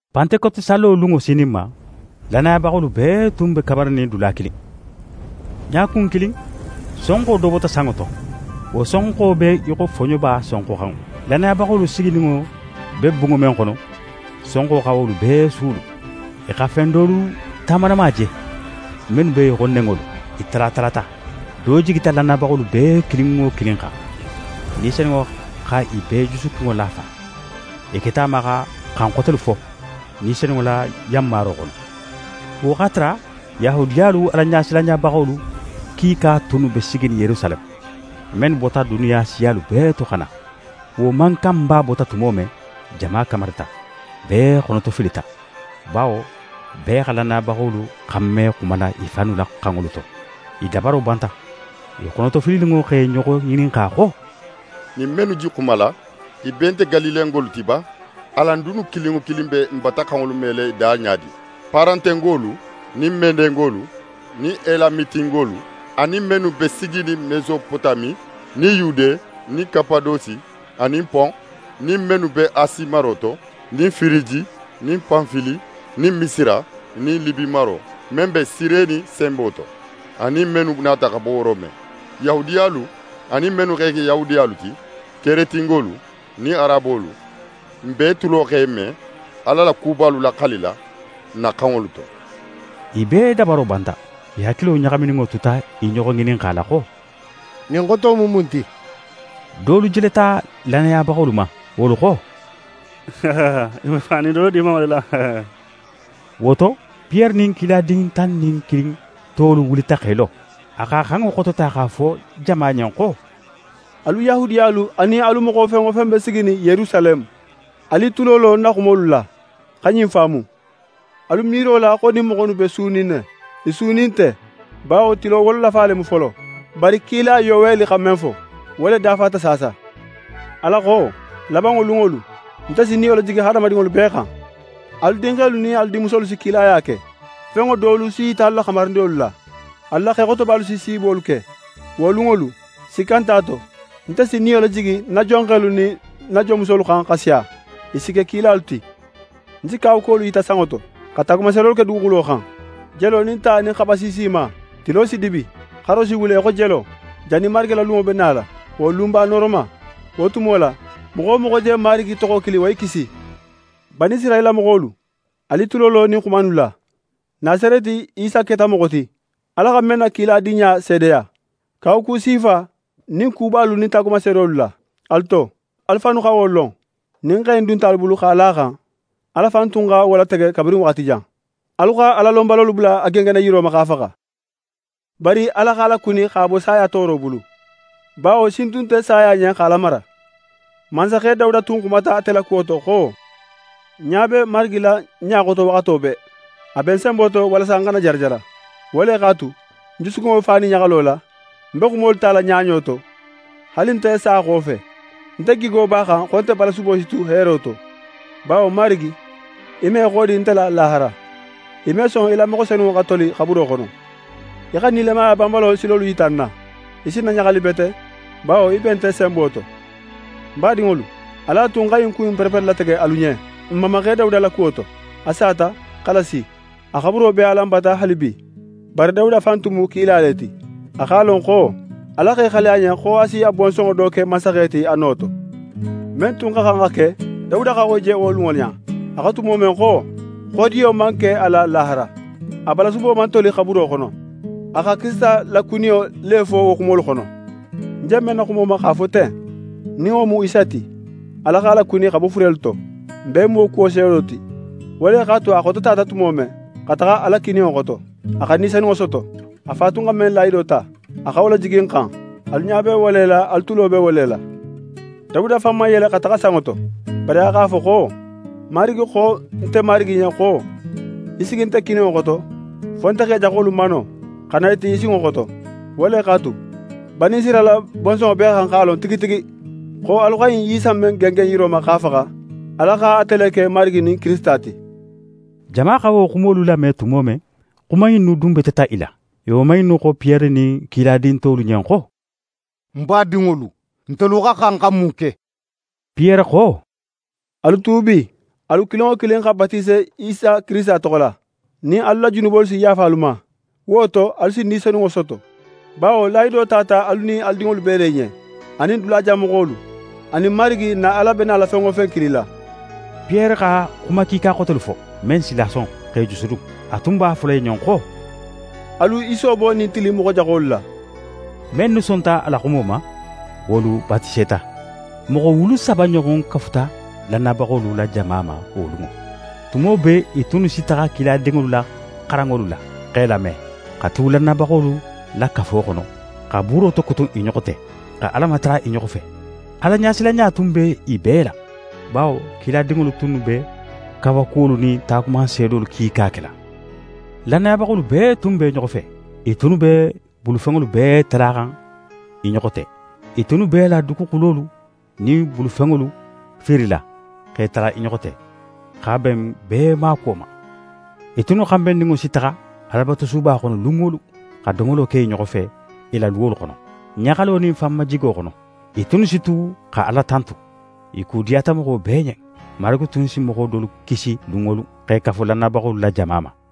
Pantekoti sallo lunŋo sininma, lannayabaxolu bee tun be kamarinin dula kilin. Ɲakun kilin, sonxo do bota sanŋo to. Wo sonxo be í xo foɲoba sonxoxanŋo. Lannayabaxolu sigininŋo be bunŋo men xono, sonxo xa wo bee suulu. I xa fen dolu tamanama je, mennu be í xo nenŋolu. I talatalata. Do jigita lannayabaxolu bee kilin wo kilin xan. Ni Senunŋo xa i bee jusukunŋo lafa. I keta a ma xa xan xotelu fo, Ni Senunŋo la yanmaro xono. Wo x'a tara Yahudiyalu Alaɲasilanɲabaxolu kiika tunnu be siginin Yerusaleme, mennu bota duniya siyalu bee to xa na. Wo mankanba bota tumo men, jama kamarita. Bee xonotofilita, bawo bee xa lannayabaxolu xanme xumala i fannu la xanŋolu to. I dabaro banta. I xonotofilininŋo x'e ɲoxo ŋininxa xo: «Ɲin mennu je xumala, i bee nte Galilengolu ti ba? Alan dunnu kilin wo kilin be n bata xanŋolu mela i da ɲa di? Paratengolu, nin Medengolu nin Elamitingolu anin mennu be siginin Mesopotami nin Yude nin Kapadosi anin Pon nin mennu be Asi maro to, nin Firiji nin Panfili nin Misira nin Libi maro men be Sireni senbo to anin mennu nata xa bo Rome, Yahudiyalu anin mennu x'e ke Yahudiyalu ti, Keretingolu nin Arabolu, n bee tulo x'e me Ala la kubalu laxalila n na xanŋolu to.» I bee dabaro banta. I hakilo ɲaxamininŋo tuta i ɲoxo ŋininxala xo: «Ɲin xoto mu mun ti?» Dolu jeleta lannayabaxolu ma; wolu xo: «I be fanin dolo dimanŋo le la.» Wo to, Piyere nin kiladin tan nin kilin tolu wulita x'e lo. A x'a xanŋo xotota x'a fo jama ɲen xo: «Alu Yahudiyalu anin alu moxo fen wo fen be siginin Yerusaleme, alu i tulo lo ń na xumolu la, xa ɲin faamu. Alu miiro la xo ɲin moxo innu be sunin ne; i sunin nte, bawo tilo wololafa le mu folo. Bari kila Yoweli xa men fo, wo le dafata saasa: “Ala xo: Labanŋo lunŋolu, nte si ń Niyo lajigi hadamadinŋolu bee xan Alu dinxelu nin alu dinmusolu si kilaya ke. Fenŋo dolu si yita alu la xamarindinŋolu la. Alu la xexotobalu si siibolu ke. Wo lunŋolu, sikka nt'a to, nte si ń Niyo lajigi ń na jonxelu nin ń na jonmusolu xan xa siya, i si ke kilalu ti. Ń si kawakuwolu yita sanŋo to, xa taagumanseedolu ke duguxulo xan: Jelo nin ta nin xaba siisima. Tilo si dibi, xaro si wule í xo jelo, jannin Marigi la lunŋo be nala, wo lunba nooroma. Wo tumo la, moxo wo moxo je Marigi toxo kili, wo si kisi.” «Banisirayila moxolu, alu i tulo lo ɲin xuma innu la. Nasareti Isa keta moxo ti, Ala xa men na kiladinɲa seedeya, kawaku sifa nin kubalu nin taagumanseedolu la, alu to. Alu fannu xa wo lon. Ɲin xe in dunta alu bulu x'a la a xan, Ala fan tun xa wo latege kabirin waxati jan. Alu xa Alalonbalolu bula a gengenna yiro ma, x'a faxa. Bari Ala x'a lakuni x'a bo saya tooro bulu, bawo sin tun nte saya ɲen x'a lamara. Mansaxe Dawuda tun xumata ate la kuwo to xo: “Ń ɲa be Marigi la ń ɲa xoto waxato bee, a be ń senbo to, walasa ń xana jarajara. Wo le x'a tu, ń jusukunŋo be fanin ɲaxalo la, ń be xumolu tala ɲaɲo to; haali nte sa xofe, nte gigo b'a xan xo nte balasubo si tu heero to, bawo, Marigi, í me í xodi nte la lahara; í me son í la moxo senunŋo xa toli xaburo xono. Í xa nilamaya banbalo silolu yita ń na, í si ń na ɲaxali bete, bawo í be nte senbo to.” «Ń badinŋolu, alu a tu ń xa ɲin ku in pereperelatege alu ɲen n mamaxe Dawuda la kuwo to. A sata, xa lasi. A xaburo be alan bata haalibi. Bari Dawuda fan tun mu kila le ti, a x'a lon xo Ala x'é xali a ɲen xo a si a bonsonŋo do ke mansaxe ti a no to. Men tun xa xan xa ke, Dawuda xa wo je wo lunŋo ɲa. A xo tumo men xo: “Xodiyo man ke a la lahara, a balasubo man toli xaburo xono.” A xa Kirisita la kuniyo le fo wo xumolu xono. Ń je men na xumo ma x'a fo ten, nin wo mu Isa ti, Ala x'a lakuni xa bo furelu to. N bee mu wo kuwo seedo ti. Wo le x'a tu a xototata tumo men, xa taxa Ala kininŋo xoto, a xa Ni Senunŋo soto, a Fa tun xa men lahido ta, a xa wo lajigi n xan. Alu ɲa be wo le la, alu tulo be wo le la. Dawuda fan man yele xa taxa sanŋo to, bari a x'a fo xo: “Marigi xo nte Marigi ɲen xo: Í sigi nte kininŋo xoto, fo nte x'é jaxolu mano, xa na i ti í sinŋo xoto.” Wo le x'a tu, Banisirayila bonsonŋo bee xa xan x'a lon tigi tigi, xo alu xa ɲin Isa in men gengen yiro ma, x'a faxa, Ala xa ate le ke Marigi nin Kirisita ti.» Jama xa wo xumolu lame tumo men, xuma innu dunbeteta i la. I woman innu xo Piyere nin kiladin tolu ɲen xo: «N badinŋolu, ntelu xa xan xa mun ke?» Piyere xo: «Alu tuubi, alu kilin wo kilin xa batise Isa Kirisita toxo la, nin alu la junubolu si yaafa alu ma. Wo to, alu si Ni Senunŋo soto. Bawo lahido tata alu nin alu dinŋolu bee le ɲen, anin dulajan moxolu, anin Marigi n na Ala be nala fen wo fen kilila.» Piyere xa xuma kiika xotelu fo, men s'i lason, x'e jusudun. A tun b'a fola i ɲen xo: «Alu i soobo ɲin tili in moxo jaxolu la.» Mennu sonta a la xumo ma, wolu batiseta. Moxo wulu saba ɲoxon kafuta lannayabaxolu la jama ma wo lunŋo. Tumo bee, i tunnu si taxa kiladinŋolu la xaranŋolu la, x'e lame, xa tu lannayabaxolu la kafo xono, xa buuro tokutun i ɲoxo te, xa Ala matara i ɲoxo fe. Alaɲasilanɲa tun be i bee la, bawo kiladinŋolu tunnu be kawakuwolu nin taagumanseedolu kiika kela. Lannayabaxolu bee tun b'e ɲoxo fe. I tunnu b'e bulufenŋolu bee talaxan i ɲoxo te. I tunnu b'e la duguxulolu nin i bulufenŋolu fiirila, x'e tala i ɲoxo te, x'a ben bee maakuwo ma. I tunnu xanbenninŋo si taxa Alabatusuba xono lun wo lun, xa domolo ke i ɲoxo fe i la luwolu xono, ɲaxalo nin fanmajigo xono. I tunnu si tu xa Ala tantu. I ku diyata moxo bee ɲen. Marigi tun si moxo dolu kisi lun wo lun, x'e kafu lannayabaxolu la jama ma.